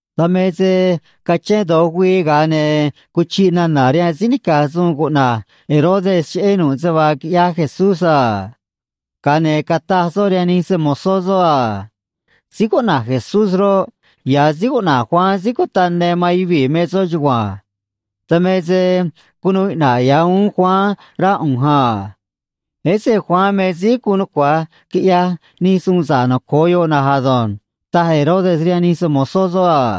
Dan me se cachén do̱j güii, ga̱a ne̱ cuchiꞌ nana̱ rihaan síí nica̱j suun cuꞌna̱j Herodes cheꞌé nu̱ꞌ se vaa quiꞌyaj Jesucristó a. Ga̱a ne̱ cataj soꞌ rihaan nij se‑mo̱zó soꞌ a: ―Síí cuꞌna̱j Jesucristó roꞌ, ya̱ síí cuꞌna̱j Juan síí cutaꞌ ne man yuvii̱ me soꞌ á. Dan me se cunuu iꞌna̱ꞌ ya̱ uún síí cuꞌna̱j Juan, raj á. Ése̱ síí cuꞌna̱j Juan me síí guun nucua̱j quiꞌyaj nij suun sa̱ꞌ noco̱o yoꞌ na̱nj ado̱nj ―taj Herodes rihaan nij se‑mo̱zó soꞌ a.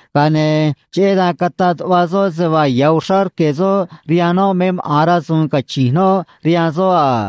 ga̱a ne̱ cheꞌé dan cataꞌ tuꞌva soꞌ se vaa ya̱ uxrá rque̱ soꞌ rihaan noꞌ me maꞌa̱n rasu̱u̱n cachi̱nj noꞌ rihaan soꞌ a.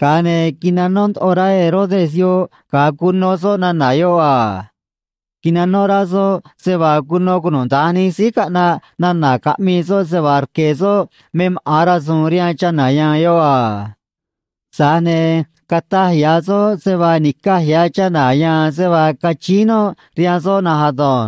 Ga̱a ne̱ quinanó ndoꞌo rá síí cuꞌna̱j Herodes yoꞌ ga̱a cuno soꞌ nana̱ yoꞌ a. Quinanó rá soꞌ se vaa cuno cunuda̱nj nij síí caꞌnaꞌ nana̱ caꞌmii soꞌ se vaa rque̱ soꞌ me maꞌa̱n rasu̱u̱n rihaan chana̱ ya̱a̱n yoꞌ a. Tza̱j ne̱ cataj xnaꞌanj soꞌ se vaa ni̱caj ya̱ chana̱ ya̱a̱n se vaa cachíín noꞌ rihaan soꞌ na̱nj á.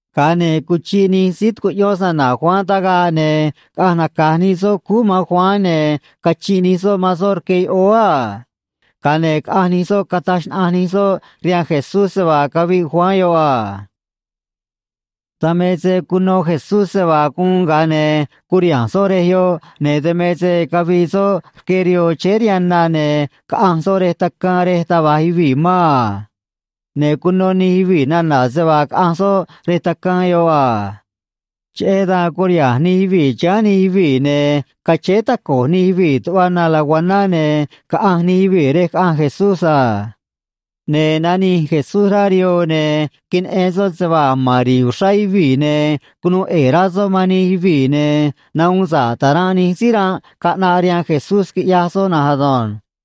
Ga̱a ne̱ cuchiꞌ nij síí tucuꞌyón se‑na̱na̱ Juan tagaꞌ, ne̱ caꞌanj naca̱j nij soꞌ cúú man síí cuꞌna̱j Juan, ne̱ cachinꞌ nij soꞌ man soꞌ rque yoꞌóó a. Ga̱a ne̱ caꞌanj nij soꞌ, cataj xnaꞌanj nij soꞌ rihaan Jesucristó se vaa caviꞌ síí cuꞌna̱j Juan yoꞌ a. Dan me se cuno Jesucristó da̱j cataj síí cuꞌna̱j Herodes cheꞌé soꞌ, ne̱ cheꞌé dan curiha̱nj Jesucristó rej yoꞌ, ne̱ dan me se cavii soꞌ rque rihoo chéé rihaan na, ne̱ caꞌanj soꞌ rej quij rej taj va̱j yuvii̱ mán a. Ne̱ cuno nij yuvii̱ nana̱ se vaa caꞌanj soꞌ rej quij yoꞌ a. Cheꞌé dan curiha̱nj nij yuvii̱ chiháán nij yuvii̱, ne̱ cachéé taco̱j nij yuvii̱ tuꞌva na lacuaná, ne̱ caꞌanj nij yuvii̱ rej caꞌanj Jesucristó a. Ne̱ nanij Jesucristó rá rihoo, ne̱ queneꞌen soꞌ se vaa a̱j mán uxrá yuvii̱, ne̱ cunuu ꞌe̱e̱ rá soꞌ man nij yuvii̱, ne̱ nahuun sa̱ꞌ taranꞌ nij síí ranꞌ caꞌnaꞌ, quiꞌyaj soꞌ na̱nj ado̱nj.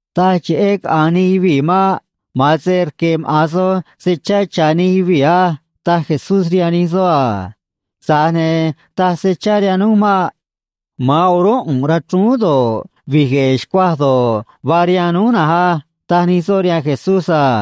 ―Taj cheꞌé caꞌa̱nj nij yuvii̱ maꞌ. Ma̱a̱n se go̱ꞌ maꞌa̱n soj se chá cha̱ nij yuvii̱ á ―taj Jesucristó rihaan nij soꞌ a. ―Tza̱j ne̱ taj se chá rihaan núj nihánj maꞌ. Ma̱a̱n o̱rúnꞌ ꞌu̱nꞌ rachrúún do̱ꞌ, vi̱j gue̱e̱ xcuaj do̱ꞌ, vaa rihaan núj na̱nj á ―taj nij soꞌ rihaan Jesucristó a.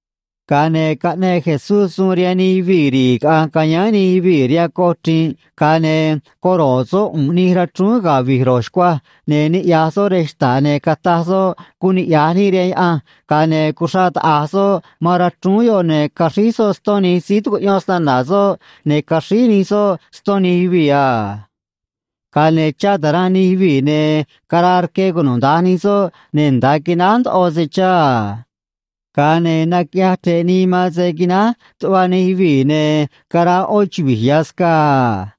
Ga̱a ne̱ caꞌneꞌ Jesucristó suun rihaan nij yuvii̱ caꞌa̱nj ca̱yáán nij yuvii̱ rihaan coj chri̱nꞌ, ga̱a ne̱ coro̱ꞌ soꞌ ꞌu̱nꞌ nij rachrúún ne̱ vi̱j ro̱j xcuaj, ne̱ niꞌya̱j soꞌ rej xta̱ꞌ, ne̱ nagoꞌ soꞌ graciá rihaan Diose̱, ga̱a ne̱ cuxraꞌ taꞌa̱j soꞌ man rachrúún yoꞌ, ne̱ caxríj soꞌ ston nij síí tucuꞌyón se‑na̱na̱ soꞌ, ne̱ caxríj nij soꞌ ston nij yuvii̱ a. Ga̱a ne̱ chá taranꞌ nij yuvii̱, ne̱ caraa rque cunuda̱nj nij soꞌ, ne̱ nda̱a quináj ndoꞌo se chá, quiꞌyaj nij yuvii̱ a. Ga̱a ne̱ naquiꞌyaj chre̱ꞌ nii man se quináj tuꞌva nij yuvii̱, ne̱ caraa yoꞌó chuvi̱j ya̱ scaa a.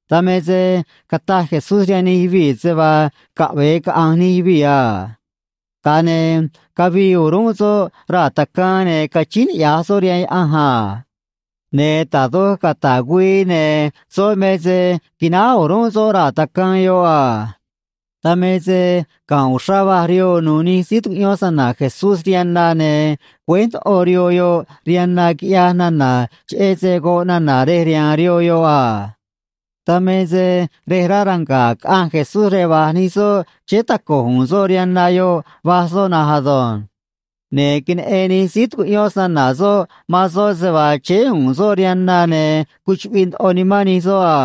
Dan me se caꞌanj nij soꞌ, ne̱ cataj Jesucristó rihaan nij yuvii̱ se vaa caꞌve̱e caꞌa̱nj nij yuvii̱ a. Ga̱a ne̱ cavii o̱rúnꞌ soꞌ raa̱ quij, ne̱ cachíín niꞌya̱j soꞌ rihaan Diose̱ a. Ne̱ da̱j doj cata̱ꞌ güii raa̱ quij, ne̱ soꞌ me se quináj soꞌ raa̱ quij yoꞌ a. Dan me se ga̱nꞌ uxrá va̱j rihoo nu̱u̱ nij síí tucuꞌyón se‑na̱na̱ Jesucristó rihaan na, ne̱ güéj ndoꞌo rihoo yoꞌ rihaan na, quiꞌyaj nana̱, cheꞌé se goꞌ nana̱ rej riha̱a̱n rihoo yoꞌ a. Dan me se yanꞌ siꞌnu̱ꞌ caꞌanj Jesucristó rej va̱j nij soꞌ, chéé taco̱j u̱u̱n soꞌ rihaan na yoꞌ, va̱j soꞌ na̱nj ado̱nj. Ne̱ queneꞌen nij síí tucuꞌyón se‑na̱na̱ soꞌ man soꞌ se vaa chéé u̱u̱n soꞌ rihaan na, ne̱ cuchuꞌviꞌ ndoꞌo nimán nij soꞌ a.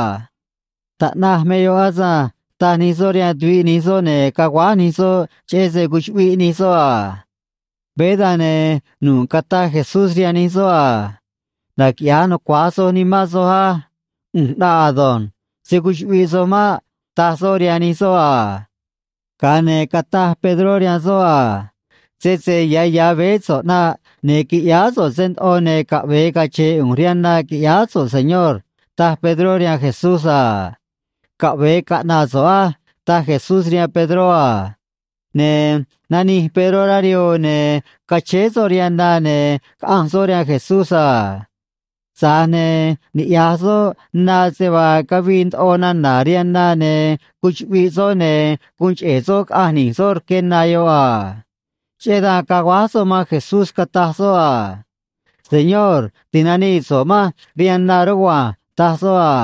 ―Taꞌnaj me yoꞌ ei ―taj nij soꞌ rihaan tuviꞌ nij soꞌ, ne̱ caguáj nij soꞌ, cheꞌé se cuchuꞌviꞌ nij soꞌ a. Veé dan, ne̱ nu̱ꞌ cataj Jesucristó rihaan nij soꞌ a: ―Naquiꞌya̱j nucua̱j soj nimán soj ei. ꞌU̱nj ꞌnaꞌ ei. Se̱ cuchuꞌviꞌ soj maꞌ ―taj soꞌ rihaan nij soꞌ a. Ga̱a ne̱ cataj Pedró rihaan soꞌ a: ―Sese ya̱ ya̱ veé so̱ꞌ ꞌnaꞌ, ne̱ qui̱ꞌyáá so̱ꞌ se ndoꞌo, ne̱ caꞌve̱e cache̱e̱ ꞌu̱nj rihaan na qui̱ꞌyáá so̱ꞌ, Señor ―taj Pedró rihaan Jesucristó a. ―Caꞌve̱e caꞌna̱ꞌ so̱ꞌ á ―taj Jesucristó rihaan Pedró a. Ne̱ nanij Pedró rá rihoo, ne̱ cachéé soꞌ rihaan na, ne̱ caꞌanj soꞌ rihaan Jesucristó a. Tza̱j ne̱ niꞌya̱j soꞌ na se vaa cavii ndoꞌo nana̱ yoꞌ, ne̱ cuchuꞌviꞌ soꞌ, ne̱ guun cheꞌe̱ soꞌ caꞌanj ni̱j soꞌ rque na yoꞌ a. Cheꞌé dan caguáj soꞌ rihaan Jesucristó, cataj soꞌ: ―Ti̱nanii so̱ꞌ manj rihaan na, Señor ―taj soꞌ a.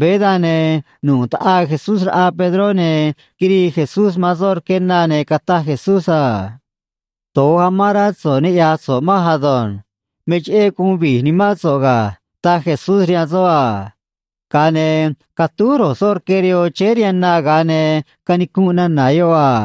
Veé dan, ne̱ nu̱ꞌ quitaꞌaa Jesucristó raꞌa Pedró, ne̱ quirii Jesucristó man soꞌ rque na, ne̱ cataj Jesucristó: ―Do̱j amán rá so̱ꞌ niꞌya̱j so̱ꞌ manj á. Me cheꞌé guun vi̱j nimán so̱ꞌ ga̱ ―taj Jesucristó rihaan soꞌ a. Ga̱a ne̱ catúj ro̱j soꞌ rque rihoo chéé rihaan na, ga̱a ne̱ canicunꞌ nana̱ yoꞌ a.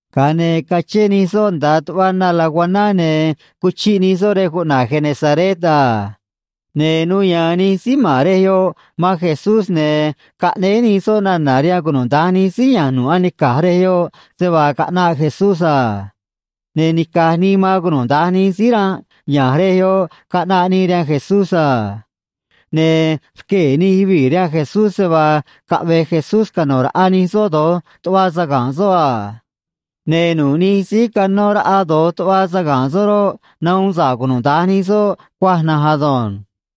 Ga̱a ne̱ cuchiꞌ nij soꞌ tuꞌva na lacuaná, ne̱ caꞌanj nij soꞌ rej cuꞌna̱j Genesaret a. Ne̱ nuu ya̱a̱n nij síí ma̱n rej yoꞌ man Jesucristó, ne̱ caꞌnéé nij soꞌ nana̱ rihaan cunuda̱nj nij síí ya̱nj nu̱ꞌ anica̱j se vaa caꞌnaꞌ Jesucristó a. Ne̱ nica̱j nii man cunuda̱nj nij síí ranꞌ ya̱nj rej yoꞌ caꞌnaꞌ nii rihaan Jesucristó a. Ne̱ cachíín niꞌya̱j uxrá nij yuvii̱ rihaan Jesucristó se vaa caꞌve̱j Jesucristó cano̱ raꞌa nij soꞌ do̱j tuꞌva saga̱nꞌ soꞌ a. Ne̱ nu̱ꞌ nij síí canó raꞌa do̱j tuꞌva saga̱nꞌ soꞌ roꞌ, nahuun sa̱ꞌ cunuda̱nj nij soꞌ cuaj na̱nj ado̱nj.